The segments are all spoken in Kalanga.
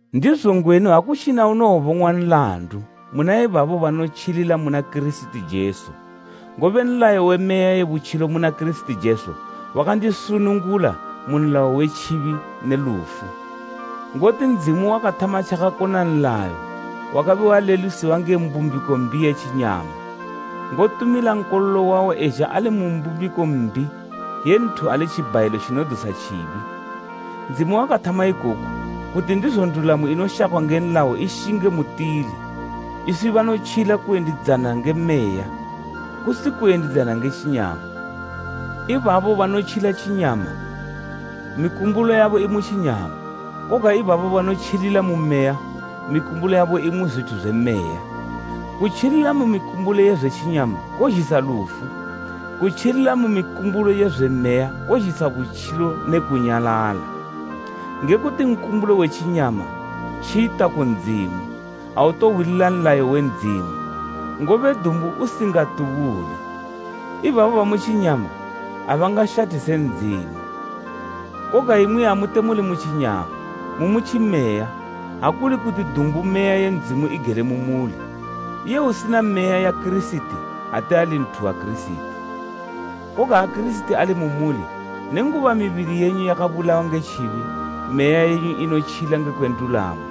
Ndizo ngwenu akutjina unowobong'wa nlandu muna ibabo banotjilila muna Kirisiti Jesu, ngobe nlayo we Meya ye butjilo muna Kirisiti Jesu wakandisunungula mu nlayo we tjibi ne lufu. Ngoti Ndzimu wakathama tjakakona nlayo wakabe walelusiwa nge mbumbiko mbi ye tjinyama, ngotumila Nkololo wawo ezha ali mu mbumbiko mbi ye nthu ali tjibhayilo tjinodusa tjibi. Ndzimu wakathama ikoku, kuti ndizo ndulamo inoshakwa nge nlayo ishinge mutili, iswi banotjila kuyendidzana nge Meya, kusi kuyendidzana nge tjinyama. Ibabo banotjila tjinyama, mikumbulo yabo imu tjinyama, koga ibabo banotjilila mu Meya, mikumbulo yabo imu zwithu zwe Meya. Kutjilila mu mikumbulo ye zwe tjinyama kozhisa lufu, kutjilila mu mikumbulo ye zwe Meya kozhisa butjilo ne kunyalala. Nge kuti nkumbulo we tjinyama tjita ku Ndzimu, autohwilila nlayo we Ndzimu, ngobe dumbu usingatubule. Ibabo bamu tjinyama abangashathise Ndzimu. Koga imwi amute muli mu tjinyama, mumu Tjimeya ha kuli kuti dumbu Meya ye Ndzimu igele mu muli. Iye usina Meya ya Kirisiti ate ali nthu wa Kirisiti. Koga ha Kirisiti ali mu muli, nenguba mibili yenyu yakabulawa nge tjibi, meya yenyu inotjila ngekwe ndulamo.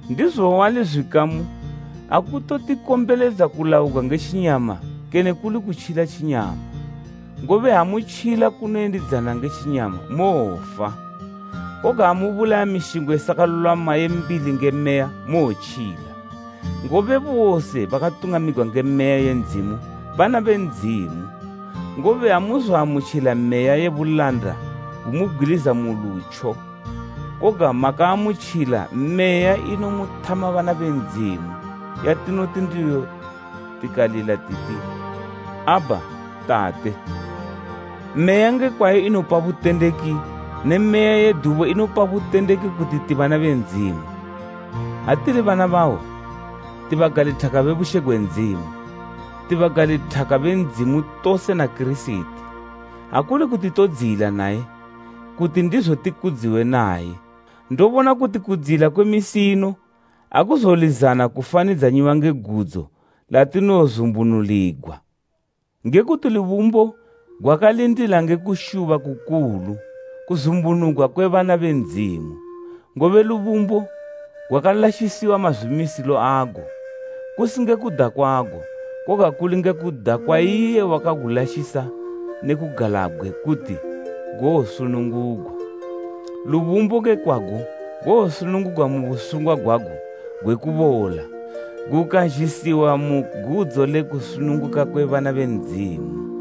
Ndizo wali zwikamu akutotikombeledza kulaugwa nge tjinyama kene kuli kutjila tjinyama, ngobe ha mutjila kunoyendidzana nge tjinyama, mowofa. Koga ha mubulaya mishingo isakalulwama ye mbili nge Meya, mowotjila. Ngobe bose bakatungamigwa nge Meya ye Ndzimu, bana be Ndzimu. Ngobe amuzoamutjila meya ye bulanda kumubgwiliza mu lutjo, koga makaamutjila Meya inomuthama bana be Ndzimu, yatinoti ndiyo tikalila titi “Abha, Tate.” Meya nge kwayo inopa butendeki ne meya yedubo inopa butendeki kuti ti bana be Ndzimu. Ha tili bana bawo, tibagalithaka be bushe gwe Ndzimu, ti bagalithaka be Ndzimu tose na Kirisiti; ha kuli kuti todziyila naye, kuti ndizo tikudziwe naye. Ndobona kuti kudziyila kwe misi ino akuzolizana kufanidzanyiwa nge gudzo latinowozumbunuligwa. Ngekuti lubumbo gwakalindila nge kushuba kukulu kuzumbunugwa kwe bana be Ndzimu. Ngobe lubumbo gwakalashisiwa mazwimisilo ago, kusi nge kuda kwago, koga kuli nge kuda kwa iye wakagulashisa ne kugalabgwe kuti gowosunungugwa. Lubumbo nge kwago gowosunungugwa mu busungwa gwago gwe kubola, gukazhisiwa mu gudzo le kusununguka kwe bana be Ndzimu.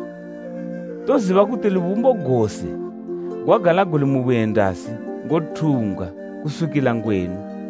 Toziba kuti lubumbo gose gwagala guli mubuyendasi ngothumbgwa kuswikila ngwenu.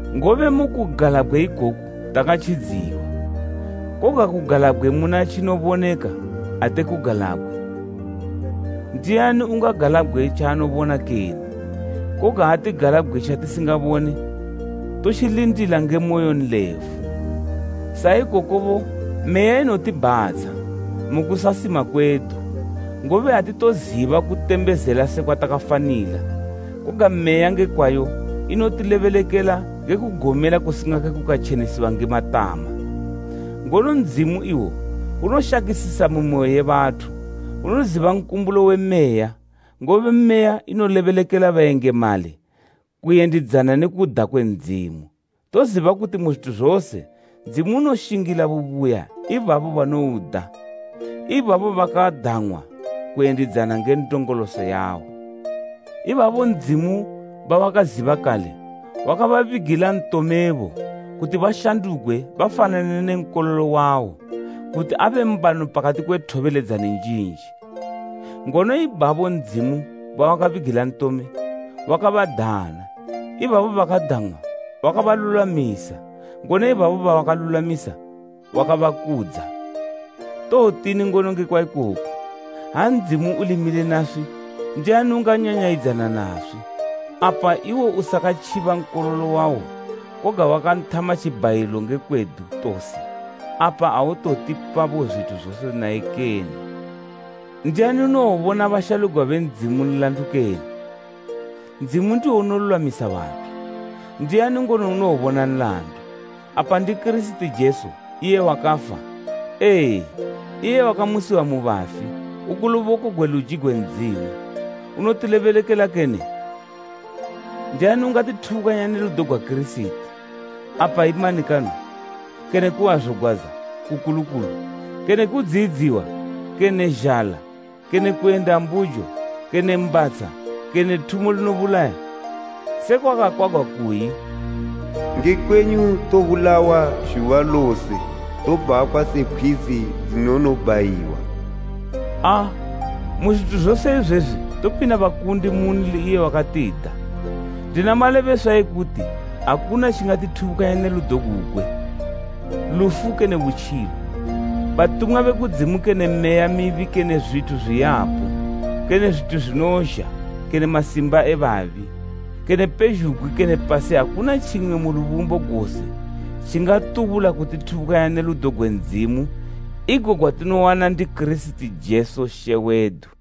Ngobe mukugalabgwe ikoku takatjidziwa. Koga kugalabgwe muna tjinoboneka ate kugalabgwe. Ndiani ungagalabgwe tjaanobona kene? Koga ha tigalabgwe tjatisingabone, totjilindila nge moyo nlefu. Saikokobo Meya inotibhatsha, mu kusasima kwedu, ngobe atitoziba kutembezela sekwa takafanila; koga Meya nge kwayo inotilebelekela nge kugomela kusingake kukatjenesiwa nge matama. Ngono Ndzimu iwo unoshakisisa mimoyo ye bathu, unoziba nkumbulo we Meya, ngobe Meya inolebelekela bayengamali kuyendidzana ne kuda kwe Ndzimu. Toziba kuti mu zwithu zose Ndzimu unoshingila bubuya ibabo banouda, ibabo bakadang'wa kuyendidzana nge ndongoloso yawo. Ibabo Ndzimu bawakaziba kale wakababigila ntomebo kuti bashandugwe bafanane ne Nkololo wawo, kuti abe mbano pakati kwe thobeledzani njinji. Ngono ibabo Ndzimu bawakabigila ntome, wakabadana, ibabo bakadang'wa wakabalulwamisa, ngono ibabo bawakalulwamisa wakabakudza. Towotini ngono ngekwa ikoku? Ha Ndzimu uli mile naswi, ndiani unganyanyayidzana naswi? Apa iwo usakatjiba Nkololo wawo koga wakanthama tjibhayilo nge kwedu tose, apa autowotipa bo zwithu zose naye kene? Ndiani unowobona bashalugwa be Ndzimu nlandu kene? Ndzimu ndiwo unolulwamisa bathu. Ndiani ngono unowobona nlandu? Apa ndi Kirisiti Jesu, iye wakafa, ee, iye wakamusiwa mu bafi uku luboko gwe luji gwe Ndzimu unotilebelekela kene? Ndiani ungatithubukanya ne ludo gwa Kirisiti? Apa i manikano, kene kuhwazogwadza kukulukulu, kene kudziyidziwa, kene zhala, kene kuyenda mbujo, kene mbatsha, kene thumo linobulaya? Sekwa kwakakwagwa kuyi, “Nge kwenyu tobulawa zhuba lose, tobhakhwa se pkhwizi dzinonobhayiwa.” Aa, mu zwithu zose izwezwi topinda bakundi munli iye wakatida. Ndina malebeswa ekuti akuna tjingatithubukanya ne ludo gugwe, lufu kene butjilo, batumwa be kudzimu kene meya mibi kene zwithu zwiyapo, kene zwithu zwinozha, kene masimba e babi, kene pezhugwi, kene pasi akuna tjimwe mu lubumbo gose tjingatubula kutithubukanya ne ludo gwe Ndzimu igo gwatinowana ndi Kirisiti Jesu She wedu.